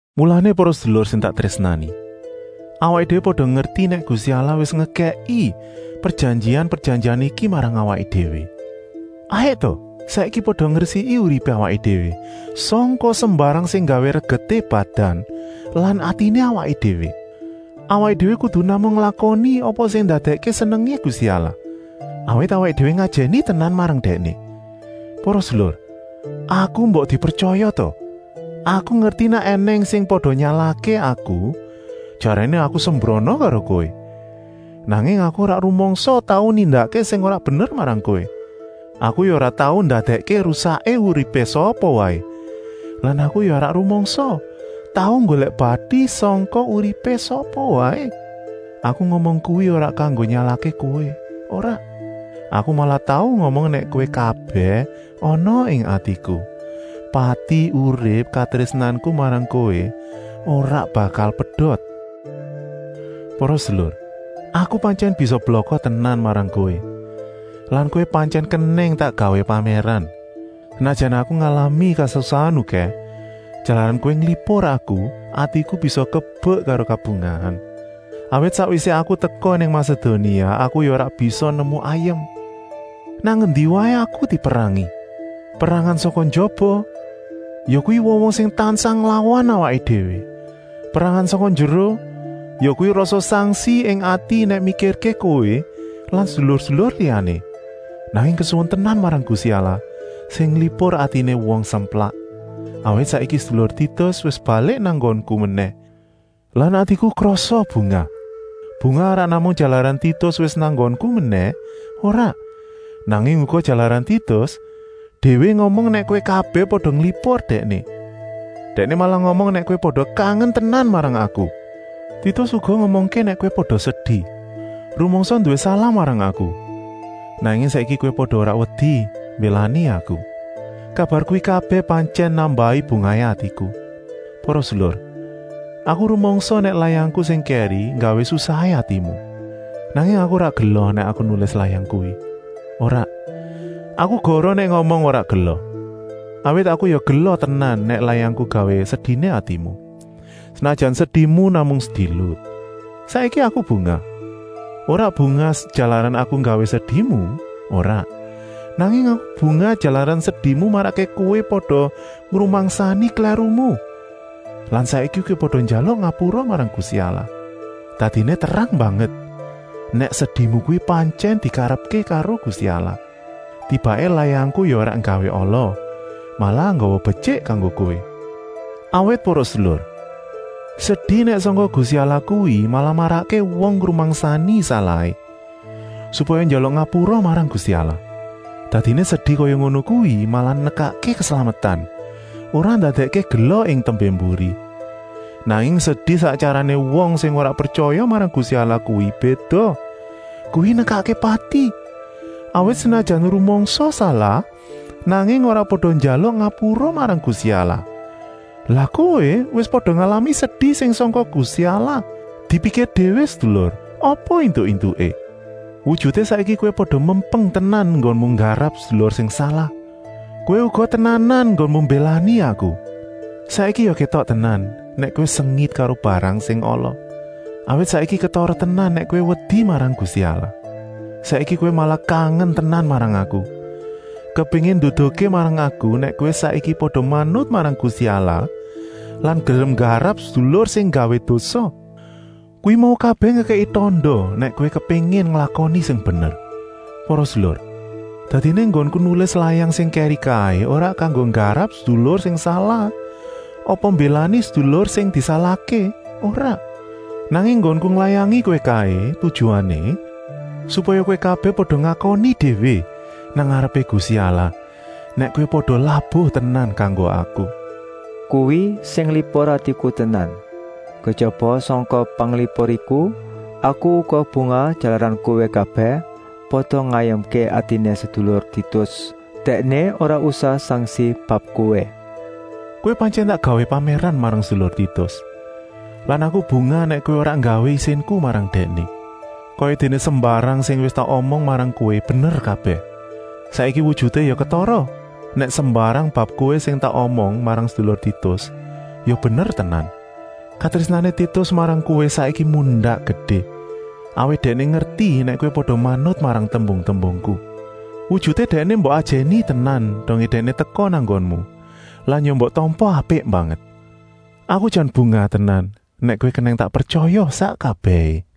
Mulané para sedulur sing tak trésnani, awaké déwé pada ngerti nèk Gusti Allah wis ngekèki prejanjian-prejanjian iki marang awaké déwé, hayuk ta saiki pada ngresiki uripé awaké déwé sangka sembarang sing nggawé regeté badan lan atiné awaké déwé. Awaké déwé kudu namung nglakoni apa sing ndadèkké senengé Gusti Allah, awit awaké déwé ngajèni tenan marang Dèkné. Para sedulur, aku mbok dipretyaya ta! Aku ngerti nèk ènèng sing pada nyalahké aku, jaréné aku sembrana karo kowé, nanging aku ora rumangsa tau nindakké sing ora bener marang kowé. Aku ya ora tau ndadèkké rusaké uripé sapa waé lan aku ya ora rumangsa tau nggolèk bati sangka uripé sapa waé. Aku ngomong kuwi ora kanggo nyalahké kowé, ora. Aku malah tau ngomong nèk kowé kabèh ana ing atiku; pati-urip katrésnanku marang kowé ora bakal pedot. Para sedulur, aku pantyèn bisa blaka tenan marang kowé lan kowé pantyèn kenèng tak gawé pamèran. Senajan aku ngalami kasusahan okèh, jalaran kowé nglipur aku, atiku bisa kebek karo kabungahan. Awit sakwisé aku teka nang Masedonia aku ya ora bisa nemu ayem. Nang endi waé aku diperang! Perangan sangka njaba, yakuwi wong-wong sing tansah nglawan awaké déwé. Perangan sangka njeruh, yakuwi rasa sangsi ing ati nèk mikirké kowé lan sedulur-sedulur liyané. Nanging kesuwun tenan marang Gusti Allah sing nglipur atiné wong semplak, awit saiki sedulur Titus wis balik nang nggonku menèh lan atiku krasa bungah. Bungah ora namung jalaran Titus wis nang nggonku menèh, ora, nanging uga jalaran Titus déwé ngomong nèk kowé kabèh pada nglipur dèkné. Dèkné malah ngomong nèk kowé pada kangen tenan marang aku. Titus uga ngomongké nèk kowé pada sedi, rumangsa nduwé salah marang aku, nanging saiki kowé pada ora wedi mbélani aku. Kabar kuwi kabèh pantyèn nambahi bungahé atiku. Para sedulur, aku rumangsa nèk layangku sing kèri nggawé susahé atimu, nanging aku ora gela nèk aku nulis layang kuwi. Ora, aku goroh nèk aku ngomong ora gela, awit aku ya gela tenan nèk layangku nggawé sediné atimu, senajan sedimu namung sedilut. Saiki aku bungah, ora bungah jalaran aku nggawé sedimu, ora, nanging aku bungah jalaran sedimu marakké kowé pada ngrumangsani klèrumu lan saiki kowé pada njaluk ngapura marang Gusti Allah. Dadiné terang banget nèk sedimu kuwi pantyèn dikarepké karo Gusti Allah. Tibaké layangku ya ora nggawé ala, malah nggawa betyik kanggo kowé. Awit para sedulur, sedi nèk sangka Gusti Allah kuwi malah marakké wong ngrumangsani salahé, supaya njaluk ngapura marang Gusti Allah. Dadiné sedi kaya ngono kuwi malah nekakké keslametan, ora ndadèkké gela ing tembé-mburi. Nanging sedi sak tyarané wong sing ora pretyaya marang Gusti Allah kuwi béda, kuwi nekakké pati. Awit senajan rumangsa salah, nanging ora pada njaluk ngapura marang Gusti Allah. Lah kowé wis pada ngalami sedi sing sangka Gusti Allah, dipikir déwé sedulur apa éntuk-éntuké! Wujuté saiki kowé pada mempeng tenan enggonmu nggarap sedulur sing salah, kowé uga tenanan enggonmu mbélani aku. Saiki ya kétok tenan nèk kowé sengit karo barang sing ala, awit saiki ketara tenan nèk kowé wedi marang Gusti Allah. Saiki kowé malah kangen tenan marang aku, kepéngin nduduhké marang aku nèk kowé saiki pada manut marang Gusti Allah lan gelem nggarap sedulur sing nggawé dosa. Kuwi mau kabèh ngekèki tanda nèk kowé kepéngin nglakoni sing bener. Para sedulur, dadiné enggonku nulis layang sing kèri kaé ora kanggo nggarap sedulur sing salah apa mbélani sedulur sing disalahké, ora. Nanging enggonku nglayangi kowé kaé tujuané, supaya kowé kabèh pada ngakoni déwé nang ngarepé Gusti Allah, nèk kowé pada labuh tenan kanggo aku. Kuwi sing nglipur atiku tenan. Kejaba sangka panglipur iku, aku uga bungah jalaran kowé kabèh pada ngayemké atiné sedulur Titus; dèkné ora usah sangsi bab kowé. Kowé pantyèn tak gawé pamèran marang sedulur Titus lan aku bungah nèk kowé ora nggawé isinku marang dèkné. Kayadéné sembarang sing wis tak omong marang kowé bener kabèh, saiki wujuté ya ketara nèk sembarang bab kowé sing tak omong marang sedulur Titus ya bener kabèh. Katrésnané Titus marang kowé saiki mundak gedé, awit dèkné ngerti nèk kowé pada manut marang tembung-tembungku. Wujuté dèkné ya mbok ajèni tenan dongé dèkné teka nang nggonmu lan ya mbok tampa apik banget. Aku jan bungah tenan nèk kowé kenèng tak pretyaya sak kabèhé.